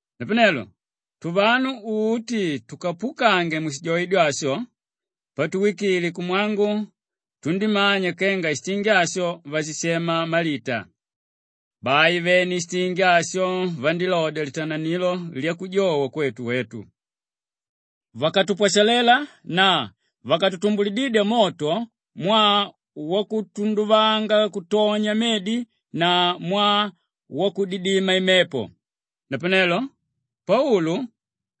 Napanelo tuvanu uti tukapukange mushijoidyo asho, patuwikile kumwangu tundímanya kenga shitingi asho vashishema Malita. Bai vene shitingi asho vandílodya litananilo lyakujowa kwetu wetu. Vakatupwashalela na vakatumbulididya moto mwaa wakutunduvanga kutonya medi na mwaa wakutudidima imepo. Napanelo Paulu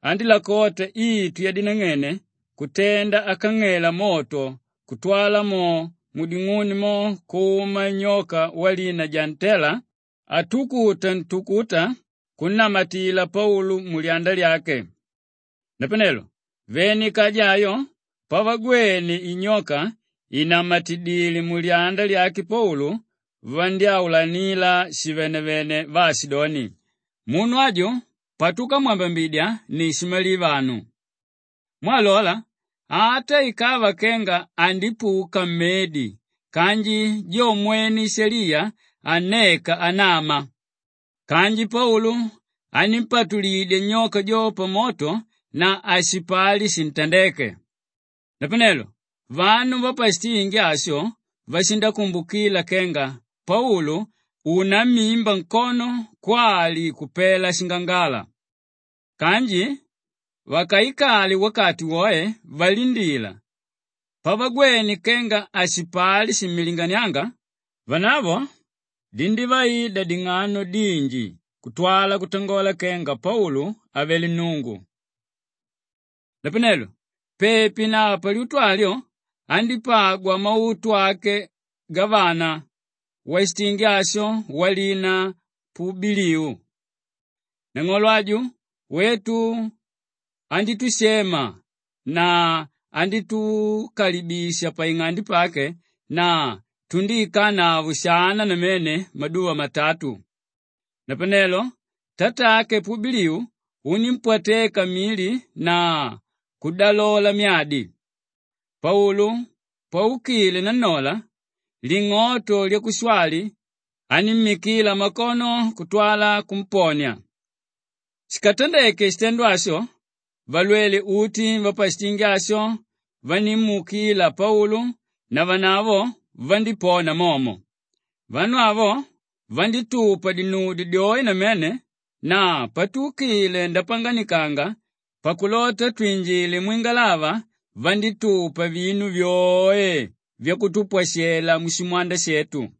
andílakota itu yadinang'ene kutenda akang'ela moto kutwala mo muding'uni mo kuma nyoka walina jaa-ntela atukuta ntukuka kunnamatila Paulu mulyanda lyake. Napanelo vene ikaja ayo pavagwene inyoka ìnamatidile mulyanda lyake Paulu, vandyáulanila shivenevene vaashidoni, “Munu aju patukamwambambidya ni shimalivanu. Mwaa lola, ata ikava kenga andipuka mmedi kanji jo mwene Ishaliya hanneka anama.” Kanji Paulu anímpatulidya nyoka jo pamoto na hashipali shintandéke. Napanelo vanu vapashitingi asho vashikumbukila kenga Paulu unammimba nkono kwali kupela shingangala. Kanji vakaikale wakati woe valindila, pavagwene kenga hashipali shimmilinganianga, vanavo dindívaida ding'ano dinji kutwala kutangola kenga Paulu avele nnungu. Napanelo pepi na palyutu alyo, andípagwa mautu ake gavana washitingi asho walina Pubiliu. Nang'olo aju wetu andítushema na andítukalibisha paing'ande pake na tundíikanavo shana namene maduva matatu. Napanelo tatake Pubiliu unímpwateka mili na kudalola myadi. Paulu paukile nannola, ling'oto lyakushwali anímmikila makono kutwala kumponia. Shikatandeke shitendo asho, valwele uti vapashitingi asho vandímuukila Paulu navanavo vandípona momo. Vanu avo vandítupa dinudyo dyoe namene na patuukile ndapanganikanga pakulota twinjile mwingalava vandítupa vinu vyoe vyakutupwashela mushimwanda shetu.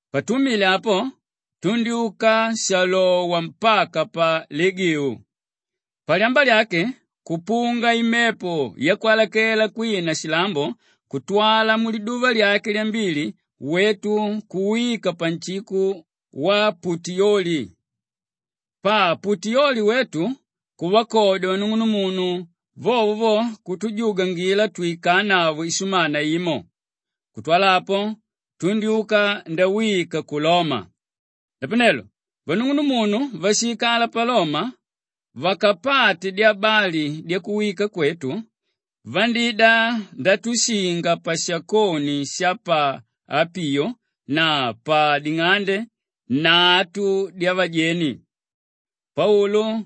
Patuumile apo, tundyúka shalowa mpaka pa Legiu. Palyamba lyake kupunga imepo yakwalakela kwina shilambo kutwala muliduva lyake lyambili wetu kuwika panshiko wa Putiyoli. Pa Putiyoli wetu kuvakodya vanung'unumunu, vovo vo kutujugwangila twikanavo ishumana imo. Kutwala apo, tundyúka ndawika ku Loma. Napanelo vanung'unumunu váshiikala pa Loma vakapate dyabali dyakuwika kwetu, vandíida ndatushinga pashakoni sha pa Apiyo na pa Ding'ande Nnatu Dyavajeni. Paulu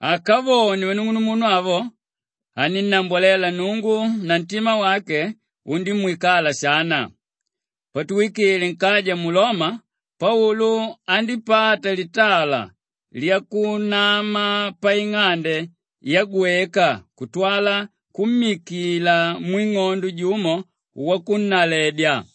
akavone vanung'unumunu avo, anínnambwalela Nnungu na ntima wake undímwikala shana. Patuwikile nkaja mu Loma, Paulu andípata litala lyakunama paing'ande yagweka kutwala kummikila mwing'ondo jumo wakunnaledya.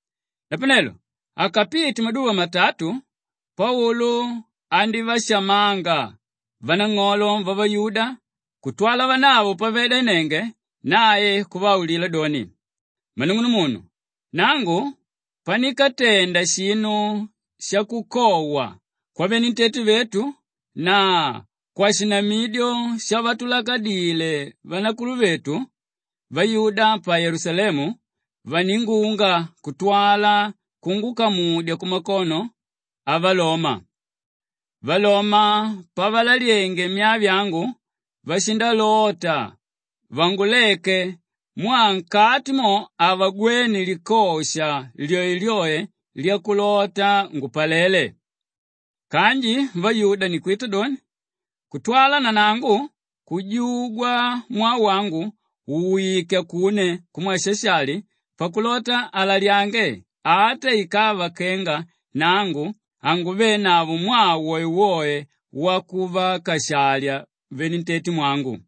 Napanelo akapite maduva matatu, Paulu andívashamanga vanang'olo vavayuda kutwala vanavo pavaidanenge nae kuvaulila doni, “Mmanung'unumunu, nangu panikatenda shinu shakukowa kwavenentete vetu na kwashinamilo shavatulakadile vanakuluvetu, vayuda pa Yelusalemu vaningunga kutwala kungukamudya kumakono avaloma. Valoma pavalalyenge myaa vyangu vashindalota vanguleke mwaa nkati mo havagwene likosha lyoelyoe lyakulota ngupalele. Kanji vayuda ni kwita doni kutwala nanangu kujugwa mwaa wangu uwike akune kumwe Shashali pakulota alalyange ata ikava kenga nangu hanguvenavo mwaa woewoe wakuvakashalya venentetemwangu.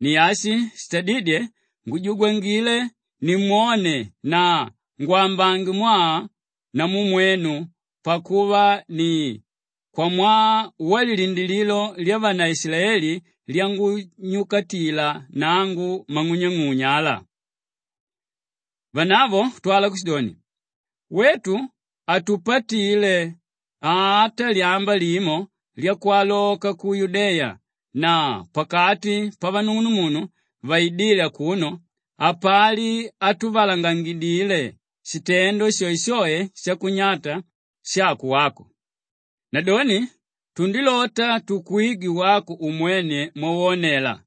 Ni ashi shitadídye ngujugwangile nimwone na ngwambange mwaa namu mwenu pakuva ni kwamwaa walilindilililo lyavanaishilaeli lyangunyukatila nangu mang'unyang'unya ala.” Vanavo kutwala kushidoni, “Wetu hatupatile ata lyamba limo lyakwaloka ku Yudeya na pakati pavanung'unumunu vaidíle akuno hapali hatuvalangangidile shitendo shoeshoe shakunyata shako wako. Nadoni tundilota tukwigwe wako umwene mwawonela.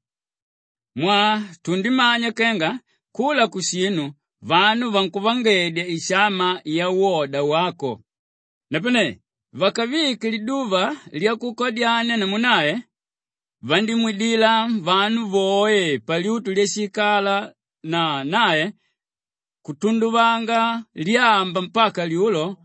Mwaa tundimanya kenga kula kushinu vanu vankuvangedya ishama yawoda wako.” Napane vakavike liduva lyakukadyania namu nae, vandímwidila vanu voe palyutu lyashiikala na nae kutunduvangila lyamba mpaka lyulo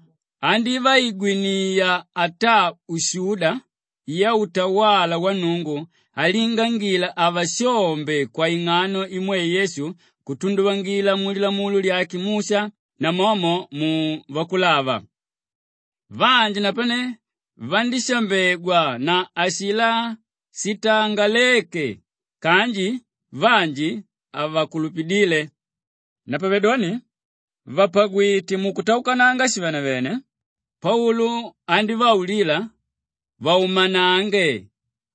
andívaigwiniya ataa ushuda yautawala wa Nnungu alingangila avashombe kwaing'ano imwe Yesu kutunduvangila mu Lilamulo lyake Musha namomo mu Vakulava. Vanji napane vandívashambegwa na ashilá shitangaléke kanji vanji havakulupidíle. Napavedoni vàpagwite mukutaukananga shivenevene, Paulu andívaulila vaumanange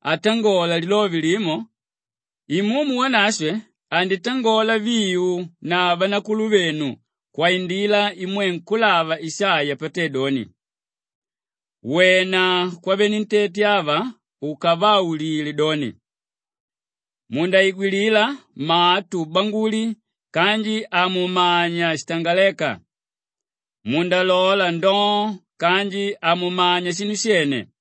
atangola lilove limo, “Imumu Wanashwe anditangola viu na vanakuluvenu kwaindila imwe nkúlava Ishaiya patédoni, “ ‘Wena kwavenentete ava ukavaulile doni, Mundaigwilila matu ngambulii kanji hamumanya shitangaléka, Mundalola ndoo kanji hamumanya shinu shene.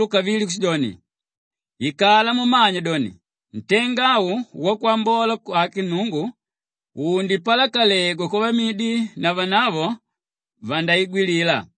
Paulu kavili kushidoni, “Ikala mumanya doni ntenga au wakwambola wake Nnungu undipalakalegwa kwavamidi na vanavo vandaigwilila.”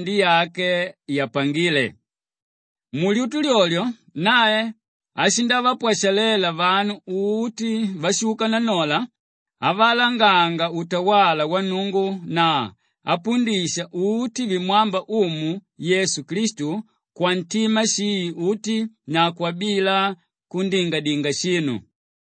Bai Paulu andíikala vyaka vivili paing'ande yake yapangíle. Mulyutu lyolyo nae ashindavapwashalela vanu uti váshuka nannola avalanganga utawala wa Nnungu na apundisha uti vimwámba Umu Yesu Klistu kwantima shii uti Kwali: …kwaungala uti. na kwabila kundingadinga shinu.